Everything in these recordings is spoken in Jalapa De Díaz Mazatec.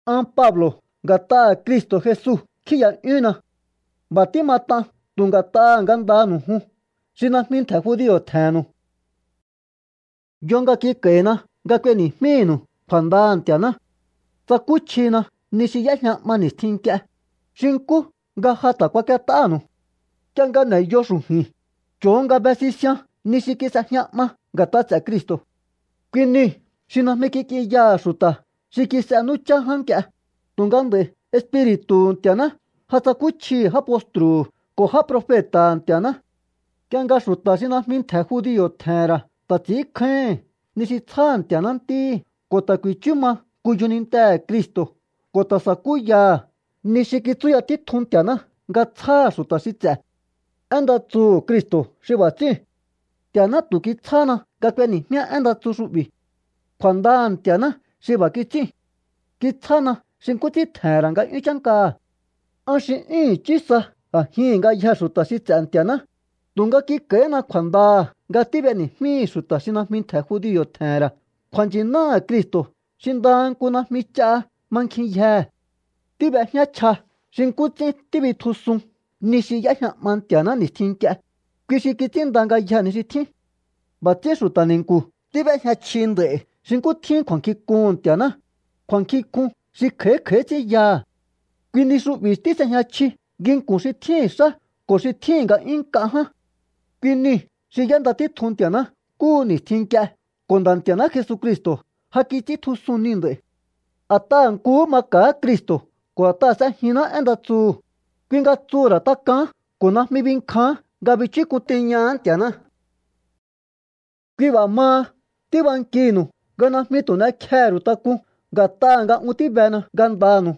An Pablo̱ nga̱t'aha̱ Cristo̱ Jesu kjíi̱ya'yúhunna. B'a̱ tímat'an tu̱ nga̱t'aha̱ ngandanu̱u jun xi najmi ntje̱ judio̱ tje̱he̱nnu̱u. Yo nga kik'a̱i̱na nga k'ueni̱jmínu̱u kju̱a̱ndaha̱ Nti̱a̱ná. Tsakúchjina ni xi y'éjña 'ma ni̱stjin nk'ie, xi nkú nga ja ta̱ kuak'iet'ánu̱u. Nk'ie nga n'e̱yo xu̱ju̱i̱n, cho̱o nga be sisian ni xi kis'ejña 'ma nga̱t'a ts'e̱ Cristo̱. Kui niu̱ xi najmi kik'inyaha̱ xu̱ta̱ xi kis'e nú chá ján nk'ie, tu̱nga nd'a̱i̱ Espiri̱tu̱hu Nti̱a̱ná ja tsakúchjihi̱ já postru̱hu̱ ko̱ já profeta̱ha̱ Nti̱a̱ná nk'ie nga xu̱ta̱ xi najmi ntje̱ judio̱ tje̱he̱n ra̱ ta̱ ts'i̱ínkjáíhi̱n ni xi tsjáha̱ Nti̱a̱ná ntíhi̱ ko̱ ta̱ ku̱i̱chú ma nku yjonintehe̱ Cristo̱ ko̱ ta̱ sa̱kú yaha̱ ni xi kitsúya títjun Nti̱a̱ná nga tsjáha̱ xu̱ta̱ xi ts'e̱. Én nda tsuhu̱ Cristo̱ xi b'a̱ ts'íu̱n. Nti̱a̱ná tu̱ kitsjáhana nga k'ueni̱jmíá én nda tsu xu'bi̱. Kju̱a̱ndaha̱ Nti̱a̱ná xi b'a̱ kits'íu̱n. Kitsjána xi nkú ts'ín tje̱he̱n ra̱ nga'yún chánkaha̱. An xi 'yún i̱chí sa a̱jihi̱n ngayjee̱ xu̱ta̱ xi ts'e̱ Nti̱a̱ná, tu̱nga kik'a̱i̱hína kju̱a̱ndaha̱ nga tíb'eni̱jmíhi̱ xu̱ta̱ xi najmi ntje̱ judio̱ tje̱he̱n ra̱ kju̱a̱nchi̱náha̱ Cristo̱ xi ndaha nku najmi ch'a mankjinyjehe̱. Tíb'ejñá chja xi nkú ts'ín tíbitjusun ni xi y'éjña 'ma Nti̱a̱ná ni̱stjin nk'ie, kui xi kits'ínnda ngayjee̱ ni xi tjín. B'a̱ ts'ín xu̱ta̱ ni̱nku̱ tíb'éjña chji nd'a̱i̱ xi nkú tjín kju̱a̱nkjink'uhu̱n Nti̱a̱ná, kju̱a̱nkjink'un xi kj'a̱í kj'a̱í ts'ín yaha̱. Kui ni xu'bi̱ tís'ejña chji nginku̱n xi tjíhi̱n xá ko̱ xi tjíhi̱n nga'yún nk'a ján. Kui niu̱ xi y'énda títjun Nti̱a̱ná nkúhu ni̱stjin nk'ie ko̱ Nda̱ Nti̱a̱ná Jesucristo̱ ja kits'íntjusun niu̱ nd'a̱i̱. A̱t'aha̱ nkuhú maka̱á Cristo̱ ko̱ a̱t'aha̱ s'ejinná én nda tsuhu̱, kui nga tsuhu̱ ra̱ tak'aán ko̱ najmi binkjaán nga bichúk'un tiñaha̱á Nti̱a̱ná. Kui b'a̱ maha tíbankihi̱nu̱u nga najmi tu̱ n'ekjehe̱ ru̱u tak'un nga̱t'aha̱ nga un tíbena ngandanu̱u.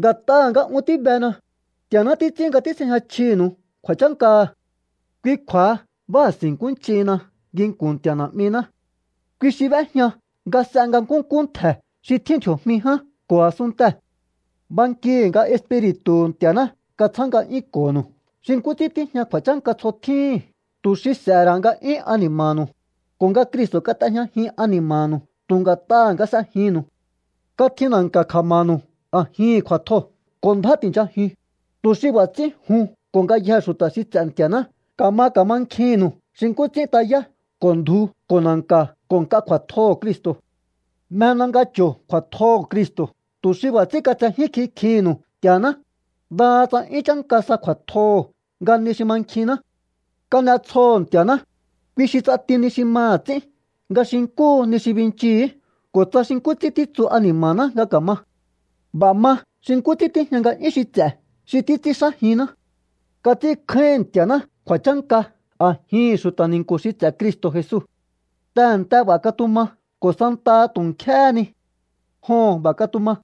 Nga̱t'aha̱ nga un tíbena, Nti̱a̱ná títs'ín nga tís'ejña chjinu̱u kju̱a̱chánkaha̱. Kui kju̱a̱ha báa̱si̱nkúnch'ihinna nginku̱n Nti̱a̱ Na̱'miná. Kui xi b'éjña nga s'e nga nkúnkú ntje̱ xi tjín ndji̱o̱jmi ján ko̱ a̱sunntee̱. Bankihi̱ nga Espiri̱tu̱hu̱ Nti̱a̱ná katsjá nga'yúnko̱ho̱nu̱u xi nkú ts'ín tíjña kju̱a̱chánka tsjo tjíhi̱n tu̱ xi s'e̱he̱ ra̱ nga'yún ani̱ma̱nu̱u, ko̱ nga Cristo̱ kat'ejñajin ani̱ma̱nu̱u tu̱ nga̱t'aha̱ nga s'ejinnu̱u. Katji na̱nka̱ kja̱ma̱nu̱u a̱jihi̱n kju̱a̱tjoo̱ ko̱ ndjá ti̱nchajiun, tu̱ xi b'a̱ ts'ín jun ko̱ ngayjee̱ xu̱ta̱ xi ts'e̱ Nti̱a̱ná ka̱ma ka̱mankjihi̱nnu̱u xi nkú ts'ín tayá ko̱ ndju ko̱ na̱nka̱ ko̱ nk'a kju̱a̱tjoho̱ Cristo̱. Mjena nga cho̱o kju̱a̱tjoho̱ Cristo̱ tu̱ xi b'a̱ ts'ín katsejín kikjihi̱nnu̱u Nti̱a̱ná, ndaha tsa 'yún chánka sa kju̱a̱tjoho̱ nga ni xi mankjinná. Kan'etsjoho̱ Nti̱a̱ná, kui xi ts'ati ni xi maha̱ ts'ín nga xi nkúhu ni xi binchihi̱í ko̱ tsa xi nkú ts'ín títsu ani̱ma̱ná nga ka̱ma. B'a̱ ma xi nkú ts'ín tíjña nga'yún xi ts'e̱ xi títs'ínxájinná. Kats'ínkjáíhi̱n Nti̱a̱ná kju̱a̱chánka a̱jihi̱n xu̱ta̱ ni̱nku̱ xi ts'e̱ Cristo̱ Jesu. Tehe̱nte b'a̱ katuma ko̱ santaha tu̱ nk'éhé ni. Joho̱n, b'a̱ katuma.